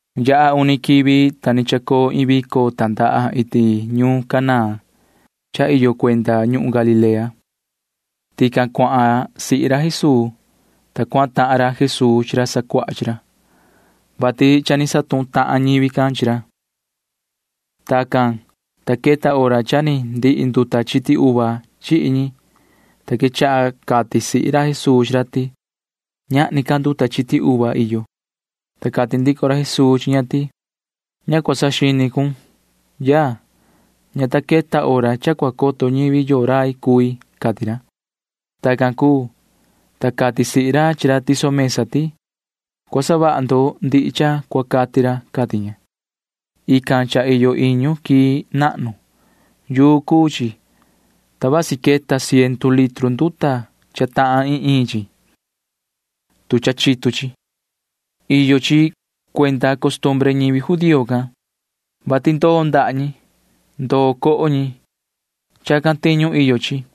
Yaha uni quivi, ta ni chacoo iin vico tandaha iti ñuun Caná cha iyo cuenda ñuhun Galilea. Tican cuahan sihi ra Jesuu, ta cuahan tahan ra Jesuu chi ra sacuaha chi ra, vati cha cana ñahan tahan ñivi can chi ra. Tacan, ta queta hora cha ni ndihi nduta chiti uva chihi ñi, ta quechaha cati sihi ra Jesuu chi ra ti: ―Ñahni ca nduta chiti uva iyo. Ta cati ndico ra Jesuu chi ña ti: ―Ña cua tichahun, yaa. Ña ta queta hora cha cua coto ñivi yoo rai cui ―cati ra. Tacan cuu, ta cati sihi ra chi ra tiso mesa ti: ―Cua savaha ndo ndihi cha cua cati ra ―cati ña. Ican cha iyo iñu quii nahnu. Yuu cuu chi, ta vasi queta ciendu litru nduta cha tahan iin iin chi, tu cha chitu chi. Iyo chi cuenda costumbre ñivi judío can, vati ndoo ndaha ñi. Ndoo coho ñi. Chacan tiñu iyo chi,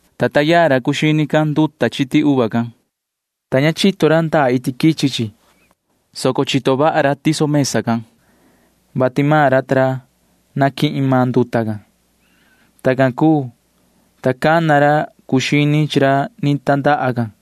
ta taa yaa ra cuu xini can nduta chiti uva can, ta ña chito ra ndaa iti quichi chi, soco chito vaha ra tiso mesa can, vati cha naquihin maan ra nduta can. Tacan cuu, ta cana ra cuu xini chi ra ni tandaha can.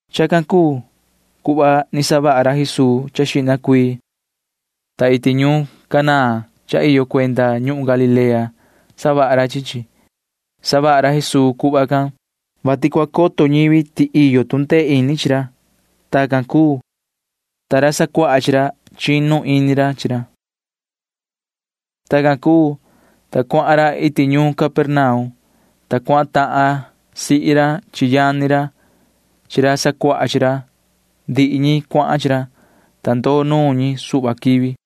Chacan cuu cuhva ni savaha ra Jesuu cha xihna cuii, ta iti ñuun Caná cha iyo cuenda ñuhun Galilea savaha ra chi chi. Savaha ra Jesuu cuhva can, vati cua coto ñivi ti iyo tu ndee ini chi ra. Tacan cuu, ta ra sacuaha chi ra―chinu ini ra chi ra. Tacan cuu, ta cuahan ra iti ñuun Capernaum, ta cuahan tahan sihi ra chi yani ra chi ra sacuaha chi ra. Ndihi ñi cuahan chi ra, ta ndoo nuun ñi suhva quivi.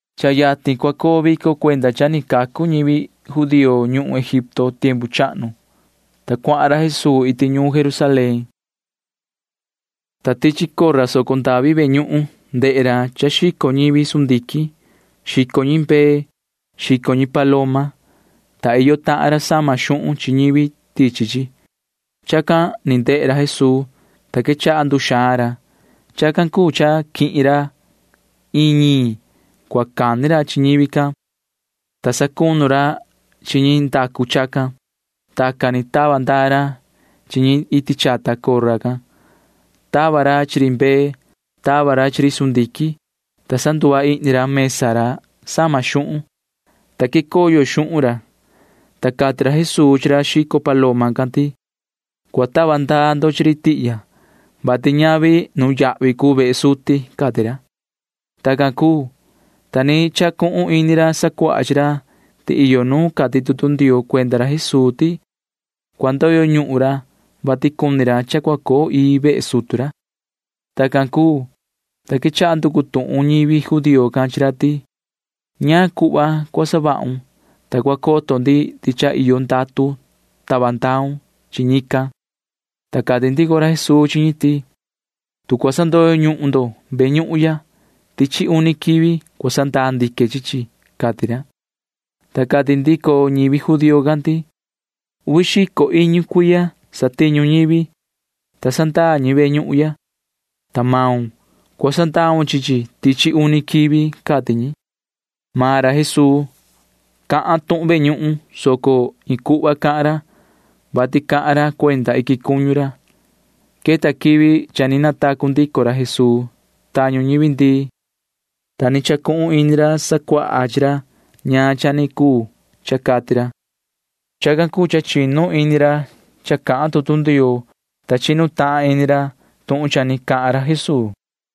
Cha yatin cua coo vico cuenda cha ni cacu ñivi judío ñuhun Egipto tiempu chahnu, ta cuahan ra Jesuu iti ñuun Jerusalén. Tican tichi soco ndavi ve ñuhun ndehe ra cha xico ñivi sundiquin. Xico ñi mbee. Xico ñi paloma. Xico ñi, ta iyo tahan ra sama xuhun ñivi tichi tican. [Chacan ni ndehe ra Jesuu, ta quechaha nduxaan ra.] Chacan cuu cha quihin ra iin ñiin cua cani ra chi ñivi can, ta sacunu ra chi ñi ndacu chacan. Tacan ni tava ndaa ra chi ñi iti chata cora can. Tava ra chi ri mbee. Tava ra chi ri sundiquin, ta sanduva ihni ra mesa ra sama xuhun, ta quicoyo xuhun ra, ta cati ra Jesuu chi ra xico paloma can ti: ―Cua tava ndaa ndo chi ri tihya, vati ñavi nuyahvi cuu vehe suti ―cati ra. Tacan cuu, ta ni chacuhun ini ra sacuaha chi ra ti iyo nu cati tutu Ndioo cuenda ra Jesuu ti cua ndoyo ñuhun ra, vati cuni ra cha cua coo ii vehe sutu ra. Tacan cuu, ta quechaha nducu tuhun ñivi judío can chi ra ti: ―¿Ñaan cuhva cua savahun, ta cua coto ndi ti cha iyo ndatu tava ndaun chi ñican? Ta cati ndico ra Jesuu chi ñi ti: ―Tu cua sandoyo ñuhun ndo ve ñuhun ya, tichi uni quivi cua sandaa ndique chi chi ―cati ra. Ta cati ndico ñivi judío can ti: ―Uvi xico iñu cuiya satiñu ñivi, ta sandaa ñi ve ñuhun ya, ta maun―cua sandaun chi chi tichi uni quivi ―cati ñi. Maan ra Jesuu cahan tuhun ve ñuhun, soco iin cuhva cahan ra, vati cahan ra cuenda iquin cuñu ra. Queta quivi cha ni natacu ndico ra Jesuu tañu ñivi ndii, ta ni chacuhun ini ra sacuaha chi ra ñaan cha ni cuu cha cati ra. Chacan cuu cha chinu ini ra cha cahan tutu Ndioo, ta chinu tahan ini ra tuhun cha ni cahan ra Jesuu.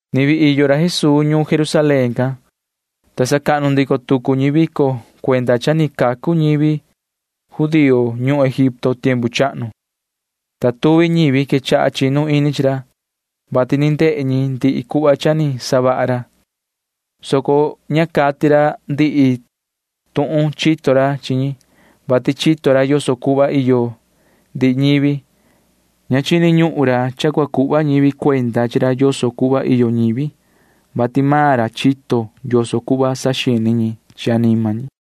Ni vii iyo ra Jesuu ñuun Jerusalén can, ta sacahnu ndico tucu ñi vico cuenda cha ni cacu ñivi ñi judío can ñuhun Egipto tiempu chahnu, ta tuvi ñivi quechaha chinu ini chi ra, vati ni ndehe ñi ndihi cuhva cha ni savaha ra, soco ña cati ra ndihi tuhun chito ra chi ñi, vati chito ra yoso cuhva iyo ndihi ñivi. Ña chini ñuhun ra cha cua cuhva ñivi cuenda chi ra yoso cuhva iyo ñivi, vati maan ra chito yoso cuhva saxini ñi chi anima ñi.